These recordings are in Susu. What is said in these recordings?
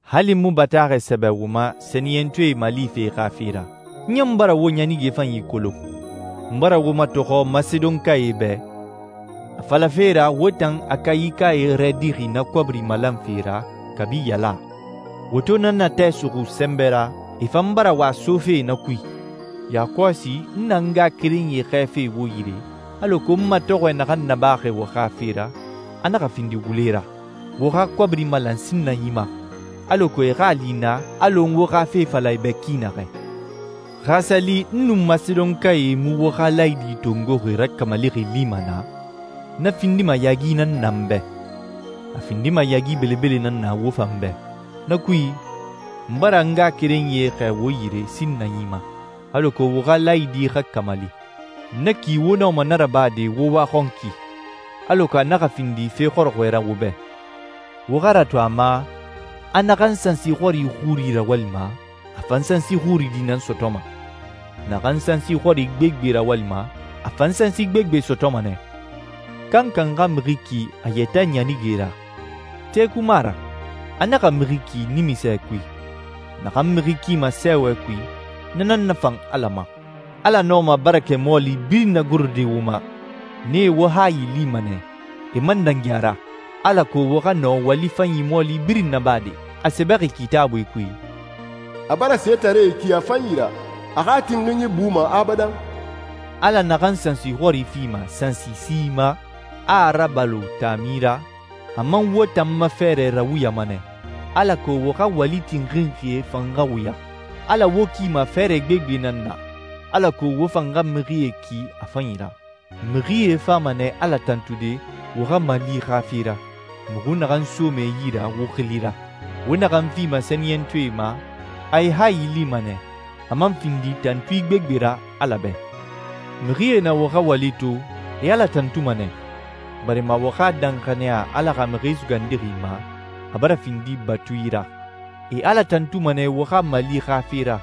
Hali n mu bataaxɛ sɛbɛ wo ma sɛniyɛntɔɛe malife xa fe ra. N ɲan bara wo ɲanige fanyi kolon. N bara wo matɔxɔ Masedonkae bɛ, a falafe ra wo tan Akayikae rɛdixi na kɔbiri malanfe ra kabi yaala. Wo to na natɛ suxu sɛnbɛ ra, e fan bara wa sofe na kui. Yakɔsi n na n ngaxakerenyie xɛɛfe wo yire, alako n matɔxɔɛ naxan nabaxi wo xa fe ra, a naxa findi wule ra. Wo xa kɔbiri malan sinnanyi ma, alako e xa a li naa alɔ n wo xa fe fala e bɛ ki naxɛ. Xa a sa li n nun Masedonkae mu wo xa laayidi tongoxi rakamalixi lima naa, na findima yaagi nan na n bɛ, a findima yaagi belebele nan na wo fan bɛ. Na kui, n bara n ngaxakerenyie xɛɛ wo yire sinnanyi ma, alako wo xa laayidi xa kamali. Na ki wo nɔma na rabade wo waxɔnki, alako a naxa findi fe xɔrɔxɔɛ ra wo bɛ. Wo xa ratu a ma, a naxan sansi xɔri xuri rawalima, a fan sansi xuri di nan sɔtɔma. Naxan sansi xɔri gbegbe rawalima, a fan sansi gbegbe sɔtɔma nɛ. Kankan xa mixi ki a yɛtɛ ɲanige ra. Teku mu a ra. A naxa mixi ki nimisɛ kui. Naxan mixi kima sɛɛwɛ kui, na nan nafan Ala ma. Ala nɔma barakɛ mɔɔli birin nagorode wo ma. Nee wo hayi lima nɛ, e man dangi a ra, alako wo xa nɔ wali fanyi mɔɔli birin nabade. A sɛbɛxi Kitaabui kui, «A bara setaree ki a fanyi ra. A xa tinxinyi buma abadan.» Ala naxan sansi xɔri fima sansisi ma, a a rabalo taami ra, a man wo tan ma fɛɛrɛ rawuyama nɛ, alako wo xa wali tinxinxie fan xa wuya. Ala wo kima fɛɛrɛ gbegbe nan na, alako wo fan xa mixie ki a fanyi ra. Mixie fama nɛ Ala tantude wo xa mali xa fe ra, muxu naxan soma e yi ra wo xili ra. Wo naxan fima sɛniyɛntɔɛe ma, a e hayi lima nɛ, a man findi tantui gbegbe ra Ala bɛ. Mixie na wo xa wali to, e Ala tantuma nɛ, barima wo xa danxaniya Ala xa Mixi Sugandixi ma, a bara findi batui ra. E Ala tantuma nɛ wo xa mali xa fe ra,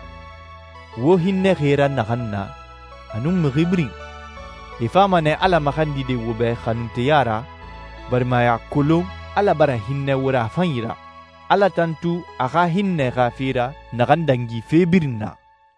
wo hinnɛxi e ra naxan na, a nun mixi birin. E fama nɛ Ala maxandide wo bɛ xanunteya ra, barima e a kolon Ala bara hinnɛ wo ra a fanyi ra. Ala tantu a xa hinnɛ xa fe ra naxan dangi fe birin na.